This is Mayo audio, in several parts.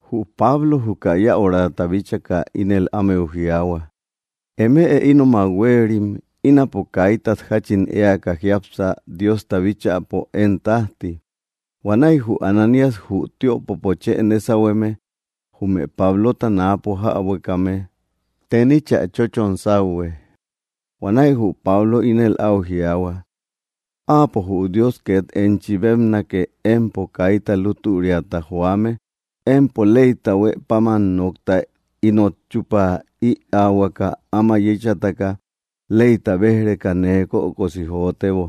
Jü Pablo juka yäurata bíchaka ínel ámeu jiaahua: —Eme ínomak huéerim, ínapo kaítat jachin éaka jiápsa Diosta bíchäpo én tajti. Huanäi jü Ananías, jü tiöpopo chë né sauhueme, jume Pablota náapo jäbuekame teníchä chóchon sauhue. Huanäi jü Pablo ínel au jiaahua: —¡Áapo jü Dios ket enchi bébnake, empo kaita lútüriata joame! Empo leyta huë páman nokta ínot chupä ïaahuaka áma yéchataka, leyta béj‑reka nee kökosi jotebo.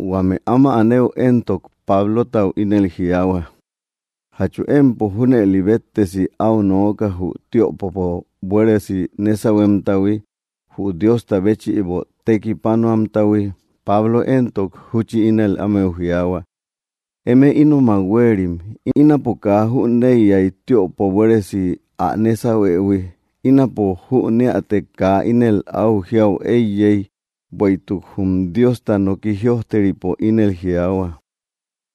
Huame áma anëu éntok, Pablotau ínel jiaahua: —¿Jatchu empo junëli béttesi au nooka jü tiöpopo buéresi nésauhuemtahui, jü Diosta béchïbo tekipánoamtahui? Pablo éntok, júchi ínel ámeu jiaahua: —Eme ínomak huéerim, ínapo kaa jüneiyai tiöpo buéresi ä nésauhuëhui. Ínapo júneätek kaa ínel au jiaü eiyei, bueïtuk jum Diosta noki jïojteripo ínel jiaahua: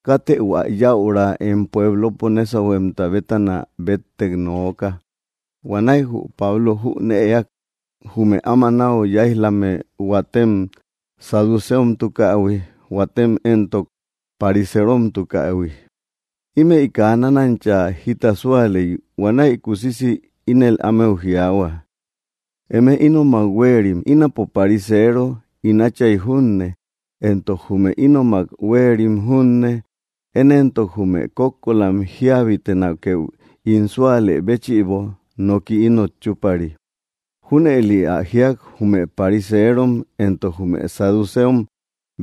“Kátë hua yäura em puéblopo nésauhuemta bétana béttek nooka.” Huanäi jü Pablo jünëak jume áma nau yáij‑lame huatem saducéomtukähui, huatem éntok, pariséromtukähui. Ímëi kaa nánancha jita súalei. Huanäi kusisi ínel ámeu jiaahua: —Eme ínomak huéerim, ínapo pariseero, ín átchay junne, éntok jume ínomak huéerim junne. Én éntok, jume kókkolam jíabitenakeu ín súalë béchïbo noki ínot chúpari. Júnëli ä jíak, jume pariseerom éntok jume saducéom,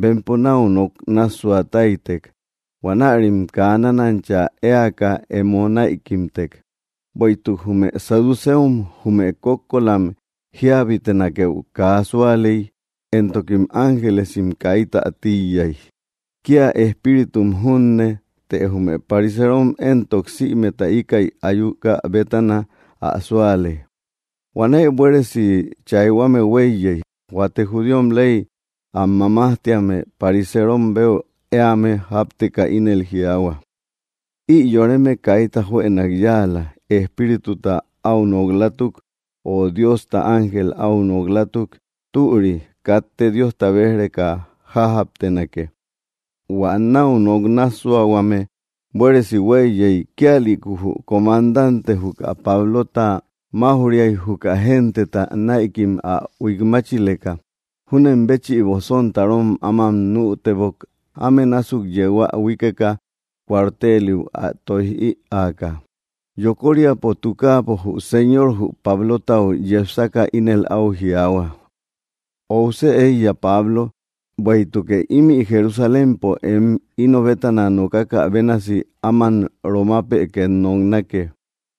bempo nau nok nássuatáitek. Huanärim kaa nánancha éaka emo näikimtek. Bueïtuk jume saducéom jume kókkolam jíabitenakeu kaa súalei, éntokim ángelesim káitä tíiyai, kia espíritum junne. Të jume parisërom éntok, sïmeta íkäi ayúkä bétana ä súale. Huanäi buéresi chaihuame hueiyei. Huate judíom ley am mamájtíame parisérom beu éame jápteka ínel jiaahua: —Ï yoreme kaita juënak yáala. Espírituta au nok‑látuk, o Diosta ángel áu nok‑latuk, türi. Katte Diosta béj‑reka jájaptenake. Huä nau nok nássuahuame buéresi hueiyei, kíalïku jü comandante juka Pablota máuj‑riai juka genteta näikim ä huikmáchileka. Junen béchïbo sontarom áman nütebok áme násuk yéu ä huíkeka cuarteliu ä toij ïaaka. Yokoríapo tukaapo, jü Señor jü Pablotau yepsaka ínel au jiaahua: —Óusë éiya, Pablo, bueïtukë ímï Jerusalémpo em ino bétana nokakä bénasi áman Romapë két noknake.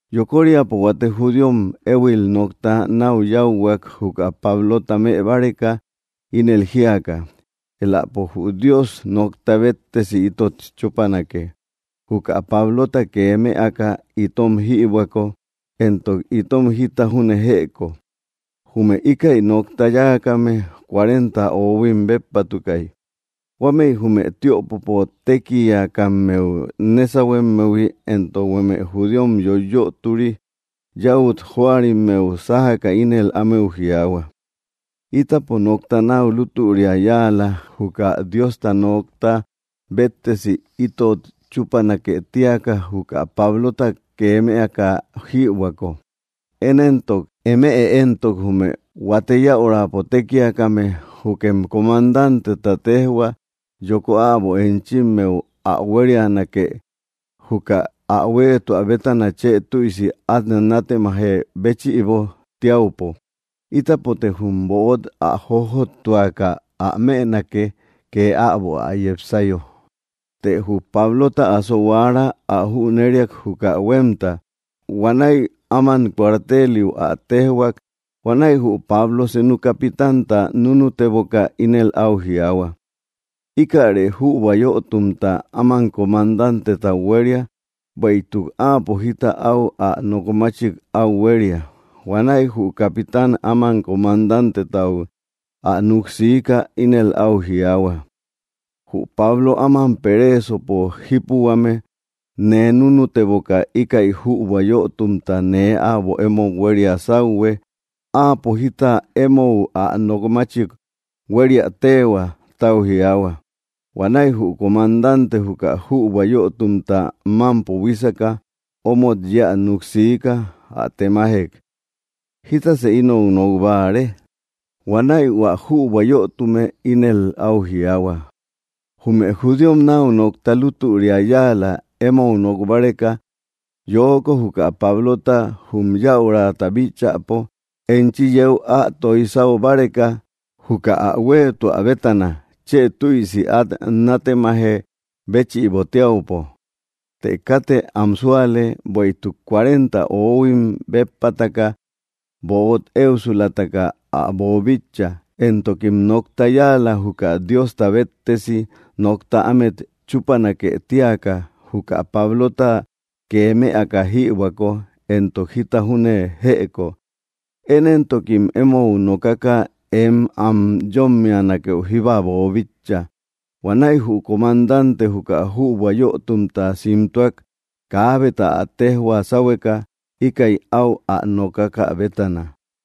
Yokoríapo huate judíom éhuil nokta nau yáuhuak juka Pablota mëbáreka, ínel jíaka: —Éläpo jü Dios nokta béttesi ítot chúpanake. Juka Pablota kee mëaka itom jïbuäko éntok itom jita júne jëko. Jume íkäi nokta yáakame cuarenta óhuim béppatukai. Huámëi jume tiöpopo tékiakammeu nésahuemmehui éntok huame judíom yoiyötori yäut jóarimmeu sájaka ínel ámeu jiaahua: —Ítapo nokta nau lútüria yáala juka Diosta nokta béttesi ítot chúpanake tíaka juka Pablota kee mëaka jïbuäko. Én éntok, eme éntok jume huate yäurapo tékiakame, jukem comandanteta téjhua, yoko äbo enchimmeu ä huérianake, juka ä huéetuä bétana chë tüisi at nátemaje béchïbo tiaupo. Ítapote jum böt ä jójottuaka ä mënake ke äbo ä yepsayo. Të jü Pablota asohuaara ä jüneriak juka huemta. Huanäi áman cuarteliu ä téjhuak. Huanäi jü Pablo senu capitanta núnuteboka ínel au jiaahua: —Íkäre jübua yötumta áman comandantetau huéria, bueïtuk áapo jita au ä nokmáchik au huéria. Huanäi jü capitán áman comandantetau ä nuksiiká ínel au jiaahua: —Jü Pablo áman peréesopo jípuhuame nee núnuteboka íkäi jübua yötumta nee äbo emou huéria sáuhue; áapo jita emou ä nokmáchik huériä téehua tau jiaahua. Huanäi jü comandante juka jübua yötumta mampo buíseka omot yéä nuksiká ä temajék: —¿Jítasë inou nok báare? Huanäi hua jübua yötume ínel au jiaahua: —Jume judíom nau nokta lútüria yáala emou nok báreka yoko juka Pablota jum yäurata bíchäpo enchi yéu ä toij sáu báreka, juka áa huéetuä bétana chë tüisi at nátemaje béchïbo tiaupo. Të kátë am súale, bueïtuk cuarenta oóhuim béppataka böt éusulataka ä boobíchaïhui, éntokim nokta yáala juka Diosta béttesi nokta ámet chúpanake tíaka, juka Pablota kee mëaka jïbuäko éntok jita júne jëko. Én éntokim emou nokaka em am yómmianakeu jíba boobíchaïhui. Huanäi jü comandante juka jübua yötumta simtúak kaábeta ä tejhua sáhueka íkäi au ä nokákä bétana.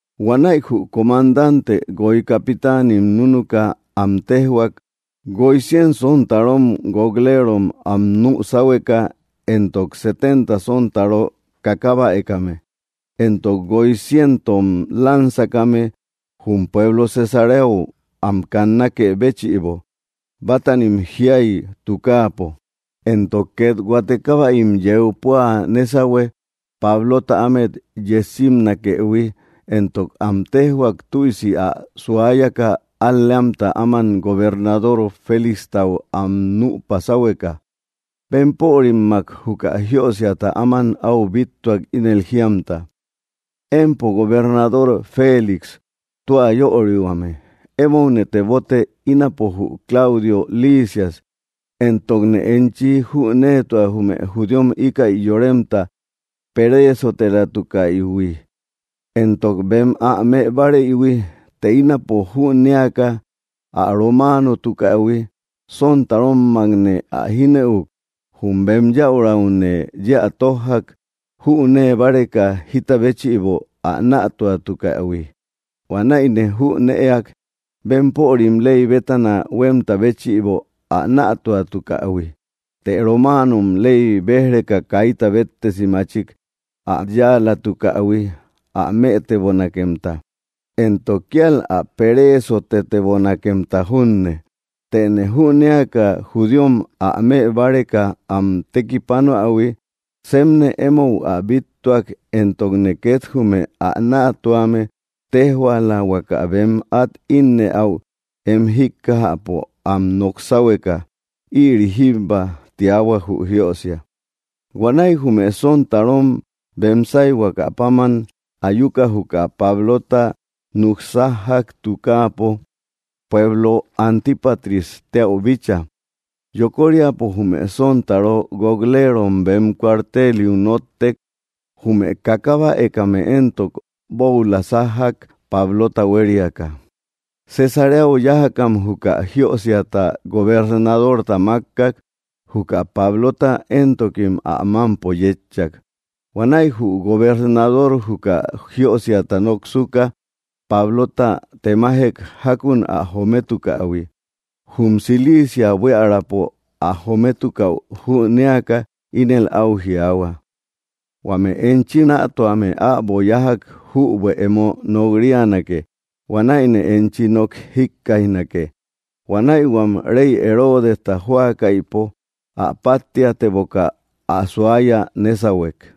Huanäi jü comandante guoi capitánim núnuka am téjhuak guoi cien sontarom guok‑léerom am nü sáhueka, éntok setenta sontaró kákabäekame, éntok guoi ciéntom lánzakame, jum pueblo Cesaréau am kannákë béchïbo bátanim jiai tukápo. Éntok ket huate kábäim yeu pua nésauhue Pablota ámet yejsimnakëhui, éntok am téjhuak tüisi ä suáyaka al‑léamta áman gobernador Félixtau am nüpa sáhueka. Bempörimmak juka jiösiata áman au bíttuak ínel jíamta: “Empo gobernador Félix tua yörihuame, émoune tebote, ínapo jü Claudio Lisias. Éntokne enchi jünéetua jume judíom íkäi yoremta pereesotelatukaïhui, éntok bem ä më báareïhui. Të ínapo jünéaka ä romáanotukähui, sontarómmakne ä jínëuk. Jum bem yäuraune yéä tójjak jünée báreka jita béchïbo ä nätuatukähui. Huanäine jünëak bempörim ley bétana huemta béchïbo ä nätuatukähui, të romáanom ley béj‑reka kaita béttesi machik ä yáalatukähui ä mëtebonakemta, éntok kíal ä peréesotebonakemta junne. Tëne jünéaka judíom ä mëbáreka am tekipánoähui, sepne emou ä bíttuak, éntokne ket jume ä nätuame téjhuaala huaka bem at ínnëäu em jíkkajäpo am nok sáhueka. Ïri jíbba”, tiahua jü jiösia. Huanäi jume sontarom bem sáihuaka páman ayuka juka Pablota nuksájjak tukáapo pueblo Antípatris téäu bícha. Yokóriapo jume sontaró guok‑léero bem cuarteliu nóttek. Jume kákabäekame éntok, bóula sájjak Pablota huériaka. Cesaréau yájakam juka jiösiata gobernadorta mákkak. Juka Pablota éntokim ä mampo yétchak. Huanäi jü gobernador juka jiósiata noksuka Pablota temájek jakun ä jométukähui. Jum Cilicia buíaräpo ä jométukäu jünéaka, ínel au jiaahua: —Huame enchi nätuame äbo yájak jübuë emo nok‑rianake, huanäine enchi nok jikkaijnake. Huanäi huam rey Heródesta jóakaïpo ä páttiateboka ä suaya nésauhuek.